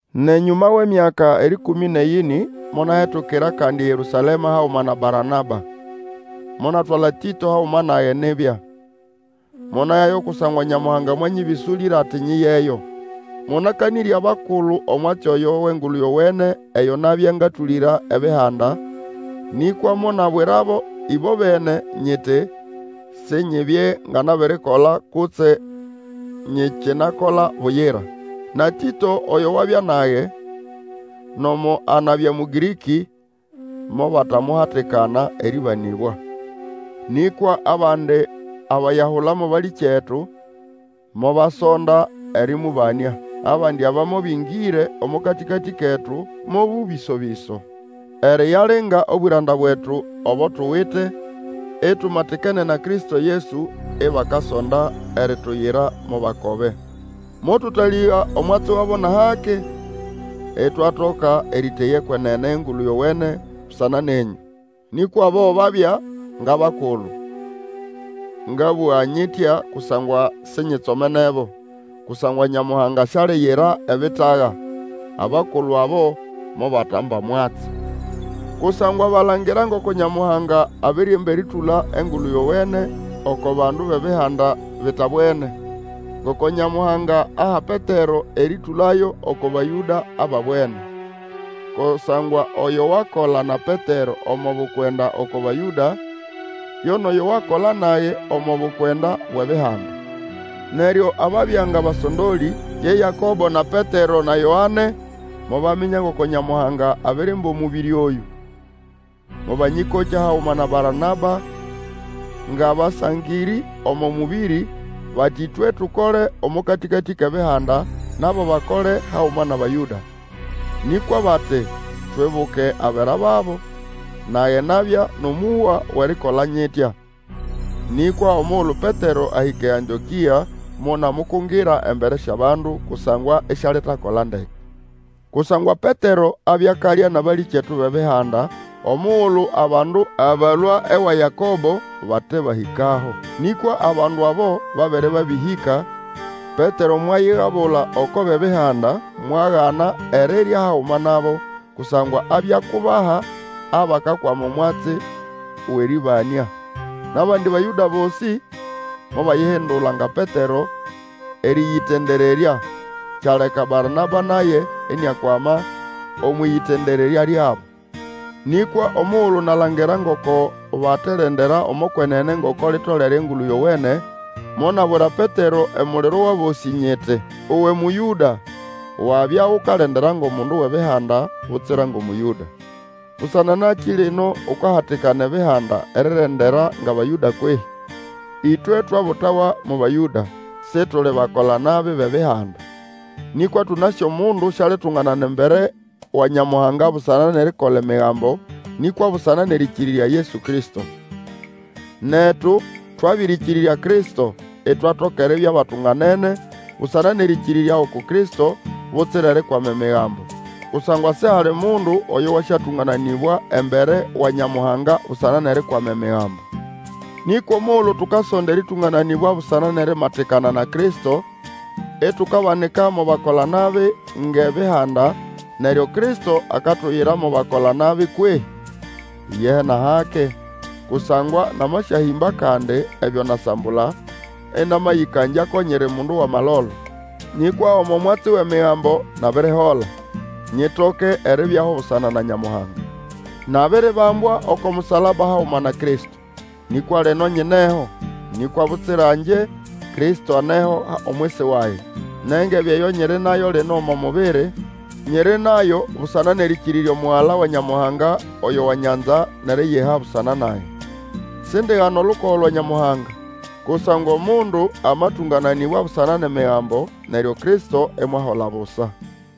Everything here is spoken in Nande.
Nʼenyũma wʼemyaka erĩkũmĩ nʼeyĩnĩ monahetukira kandi eYerũsalema haguma na Baranaba. Monatwala Tĩto haguma nage nibya. Monayayo kusangwa Nyamuhanga mwanyĩbĩsũlĩra, ati nyiyeyo. Monakanĩrya abakulu omwatsi oyo wʼEngulu Yowene eyo nabya ngatũlĩra Ebihanda, nĩkwa monabwirabo ĩbobene, nyiti sinyibye nga nabirikola kutse nyikinakola buyira. Na Tĩto, oyo wabya nage, nomo anabya Mũgĩrĩkĩ, mobatamuhatikana erĩbanĩbwa. Nĩkwa abandi abayahula mo balĩkyetu, mobasonda erĩmũbanĩa. Abandi aba mobĩngĩre omo katĩkatĩ ketu mo bũbĩso-bĩso, eriyalinga obwĩranda bwetu obo tuwite, itumatikene na Kristo Yesu, ibakasonda erituyira mo bakobe. Motũtalĩga omwatsi wabo nʼahake, itwatoka erĩteya ekwenene yʼEngulu Yowene busana nenyũ. Nĩkwa abo babya ngʼabakulu, ngabũga nyitya kusangwa sinyitsomenebo, kusangwa Nyamuhanga sialiyira ebitaga; abakulu abo mobatamba mwatsi. Kusangwa balangira ngoko Nyamuhanga abirimba erĩtũla Engulu Yowene oko bandu bʼEbihanda bitabwene, ngoko Nyamuhanga aha Petero erĩtũlayo oko Bayũda ababwene. Kusangwa oyo wakola na Petero omo bukwenda oko Bayũda, yo nʼoyo wakola nage omo bukwenda bwʼEbihanda. Neryo ababya ngʼabasondolĩ, ye Yakobo, na Petero, na Yoane, mobaminya ngoko Nyamuhanga abirimba omũbĩrĩ oyũ, mobanyĩkokya haguma na Baranaba ngʼabasangĩrĩ omo mũbĩrĩ, bati ĩtwe tukole omo katĩkatĩ kʼEbihanda, nabo bakole haguma nʼAbayũda. Nĩkwa bati twibuke abera babo, nage nabya nʼomũhwa wʼerikola nyitya. Nĩkwa omugulu Petero ahĩka eAntĩokĩa, monamukungira embere syʼabandu, kusangwa isialitakola ndeke. Kusangwa Petero abya akalya nʼabalĩkyetu bʼEbihanda, omugulu abandu abalũa ewa Yakobo bate bahĩkaho. Nĩkwa abandu abo babere babĩhĩka, Petero mwayigabula oko bʼEbihanda mwagana erirya haguma nabo, kusangwa abya akubaha abakakwama omwatsi wʼerĩbanĩa. Nʼabandi Bayũda bosĩ mobayihindula nga Petero, erĩyĩtendererya, kyaleka Baranaba naye iniakwama omwʼĩyĩtendererya lyabo. Nĩkwa omugulu nalangira ngoko baterendera omo kwenene ngoko litolere Engulu Yowene, monabwira Petero emuliro wʼabosĩ nyiti, Uwe Mũyũda, wabya ukalendera ngʼomundu wʼEbihanda, butsira ngʼOmũyũda. Busana nakĩ lino ukahatikana Ebihanda erirendera ngʼAbayũda kwehĩ? Ĩtwe twabutawa mo Bayũda, Situli bakola-nabi bʼEbihanda. Nĩkwa tũnasĩ omundu sialitunganana embere wa Nyamuhanga busana nʼerikola Emigambo, nĩkwa busana nʼerĩkĩrĩrya Yesu Kristo. Netu twabĩrĩkĩrĩrya Kristo, itwatoka eribya batunganene, busana nʼerĩkĩrĩrya uku Kristo, butsira erikwama Emigambo. Kusangwa sihali mundu oyo wasyatũngananĩbwa embere wa Nyamuhanga busana nʼerikwama Emigambo. Nĩkwa omugulu tukasonda erĩtũngananĩbwa busana nʼerimatikana na Kristo, itukabanika mo bakola-nabi ngʼEbihanda, neryo Kristo akatuyira mo bakolanabi kwehĩ? Iyehe, nʼahake! Kusangwa namaswahĩmba kandi ebyo nasambula, ĩnamayĩkangya ko nyiri mundu wʼamalolo. Nĩkwa omo mwatsi wʼEmigambo nabirihola, nyitoke eribyaho busana na Nyamuhanga. Nabiribambwa oko musalaba haguma na Kristo. Nĩkwa lino nyineho; nĩkwa butsira ngye, Kristo aneho omwisi wage. Nʼengebe eyo nyiri nayo lino omo mubiri, nyiri nalyo busana nʼerĩkĩrĩrya Omugala wa Nyamuhanga, oyo wanyanza, nʼeriyiha busana nage. Sindigana olukogo lwa Nyamuhanga; kusangwa omundu amatũngananĩbwa busana nʼEmigambo, neryo Kristo imwahola busa!